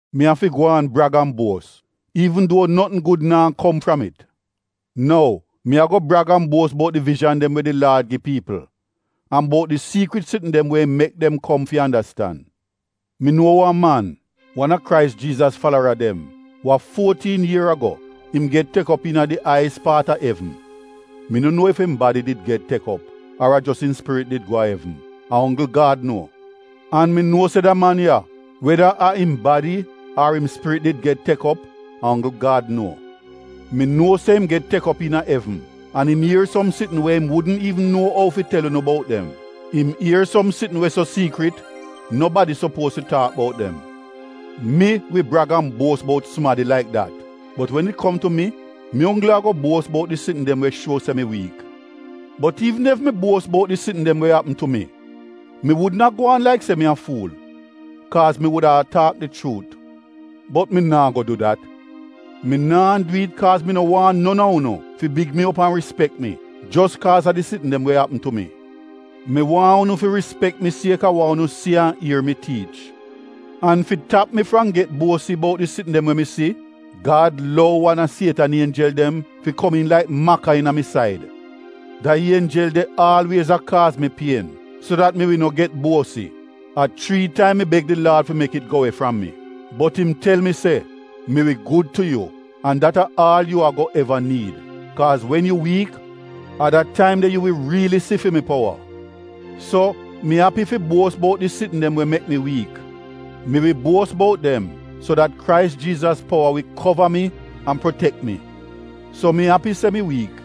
Mi afi gwaan brag an buos, iivn duo notn gud naa kom fram it. Nou, mi ago brag an buos bout di vijan dem we di Laad gi piipl an bout di siikrit sitn dem we im mek dem kom fi andastan. Mi nuo wan man, wan a Krais Jiizas falara dem, wa fuotiin ier ago, im get tek op iina di aiyis paat a evn. (Mi no nuo ef im badi did get tek op ar a jos im spirit di go a evn — a onggl Gad nuo.) An mi nuo se da man ya, (weda a im badi ar im spirit did get tek op, a onggl Gad nuo), mi nuo se im get tek op iina evn an im ier som sitn we im wudn iivn nuo ou fi tel unu bout dem. Im ier tingz we so siikrit nobadi sopuoz fi taak bout dem. Mi wi brag an buos bout sumadi laik dat, bot wen it kom tu mi, mi onggl ago buos bout di sitn dem we shuo se mi wiik. Bot iivn ef mi buos bout di sitn dem we apm tu mi, mi wudn a gwaan laik se mi a fuul, kaaz mi wuda a taak di chuut. Bot mi naa go du dat. Mi naa du it kaaz mi no waahn non a unu fi big mi op an rispek mi jos kaaz a di sitn dem we apm tu mi. Mi waahn unu fi rispek mi kaaz a wa unu si an ier mi tiich. An fi tap mi fram get buosi bout di sitn dem we mi si, Gad lou wan a sietan ienjel dem fi komiin laik maka iina mi said. Da ienjel de aalwiez a kaaz mi pien so dat mi wi no get buosi. A chrii taim mi beg di Laad fi mek it go we fram mi. Bot im tel mi se, “Mi wi gud tu yu, an dat a aal yu ago eva niid, kaaz wen yu wiik, a da taim de yu wi riili si fi mi powa.” So mi api fi buos bout di sitn dem we mek mi wiik. Mi wi buos bout dem so dat Krais Jiizas powa wi kova mi an protek mi. So mi api se mi wiik.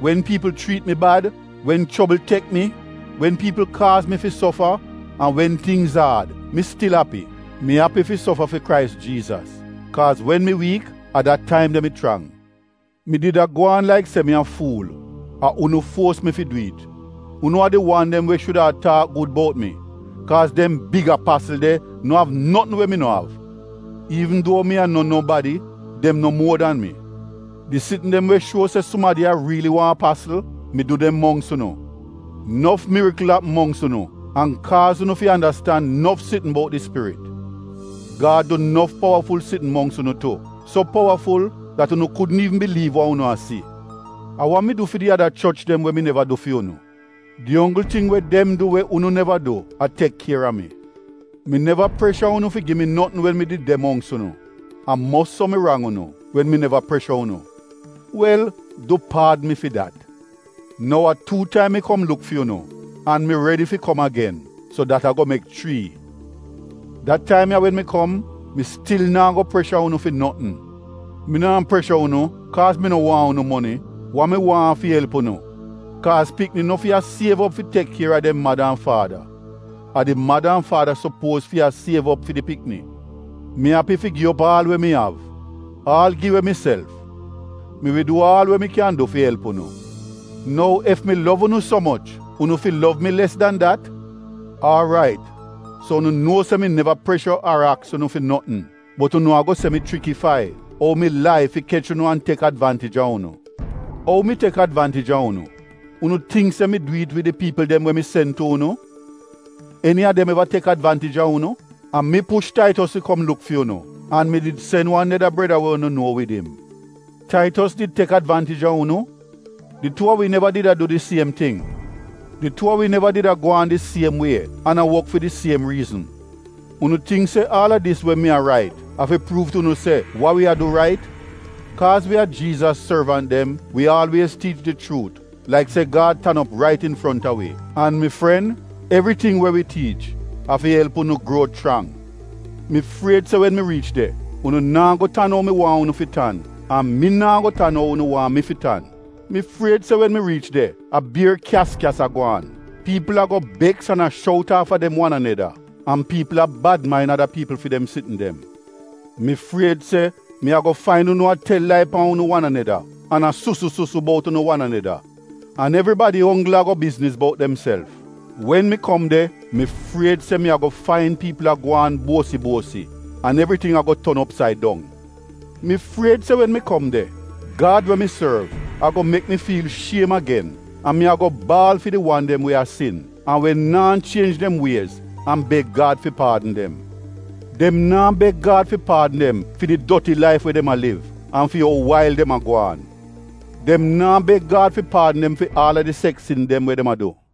Wen piipl chriit mi bad, wen chobl tek mi, wen piipl kaaz mi fi sofa an wen tingz aad, mi stil api. Mi api fi sofa fi Krais Jiizas kaaz wen mi wiik, a dat taim de mi chrang. Mi did a gwaan laik se mi a fuul! A unu fuos mi fi du it. Unu a di wan dem we shuda a taak gud bout mi kaaz dem “big apasl” de no av notn we mi no av. Iivn duo mi a no nobadi, dem no muor dan mi. Di sitn dem we shuo se sumadi a riili wan apasl, mi du dem mongks unu. Nof mirikl apm mongks unu an kaaz unu fi andastan nof tingz bout di Spirit. Gad du nof powaful sitn mongks unu tu, so powaful dat unu kudn iivn biliiv wa unu a si. A wa mi du fi di ada choch dem we mi neva du fi unu? Di onggl ting we dem du we unu neva du, a tek kier a mi. Mi neva presha unu fi gi mi notn wen mi did de mongks unu. A mos so mi rang unu, wen mi neva presha unu. Wel du paadn mi fi dat. Nou a tuu taim mi kom luk fi unu, an mi redi fi kom agen, so dat ago mek chrii. Da taim ya wen mi kom, mi stil naa go presha unu fi notn. Mi naa presha unu kaaz mi no waahn unu moni, wa mi waahn a fi elp unu. Kaaz pikni no fi a siev op fi tek kier a dem mada an faada, a di mada an faada sopuoz fi a siev op fi di pikni. Mi api fi gi op aal we mi av, aal gi we miself, mi wi du aal we mi kyan du fi elp unu. Nou ef mi lov unu so moch, unu fi lov mi les dan dat? Aarait so unu nuo se mi neva presha ar aks unu fi notn bot unu ago se mi chrikifai, ou mi lai fi kech unu an tek advaantij a unu. Ou mi tek advaantij a unu? Unu tingk se mi du it wid di piipl dem we mi sen tu unu? Eni a dem eva tek advaantij a unu? A mi push Taitos fi kom luk fi unu, an mi di sen wan neda breda we unu nuo wid im. Taitos did tek advaantij a unu? Di tuu a wi neva did a du di siem ting? Di tuu a wi neva did a gwaan di siem wie an a wok fi di siem riizn? Unu tingk se aal a dis we mi a rait, a fi pruuv tu unu se wa wi a du rait? Kaaz wi a Jiizas sorvant dem, wi aalwiez tiich di chuut laik se Gad tan op rait infronta wi, an mi fren, evriting we wi tiich a fi elp unu gruo chrang. Mi fried se wen mi riich de, unu naa go tan ou mi waahn unu fi tan an mi naa go tan ou unu waahn mi fi tan. Mi fried se wen mi riich de a bier kyas-kyas a gwaan, piipl ago beks an a shout aafa dem wan aneda, an piipl a bad main ada piipl fi dem sitn dem. Mi fried se mi ago fain unu a tel lai pan unu wan aneda an a susu-susu bout unu wan aneda an evribadi onggl ago bizniz bout demself. Wen mi kom de mi fried se mi ago fain piipl a gwaan buosi-buosi an evriting a go ton opsaid dong. Mi fried se wen mi kom de, Gad we mi sorv, ago mek mi fiil shiem agen an mi ago baal fi di wan dem we a sin, an we naa chienj dem wiez an beg Gad fi paadn dem. Dem naa beg Gad fi paadn dem fi di doti laif we dem a liv an fi ou wail dem a gwaan. Dem naa beg Gad fi paadn dem fi aal a di seks sin dem we dem a du.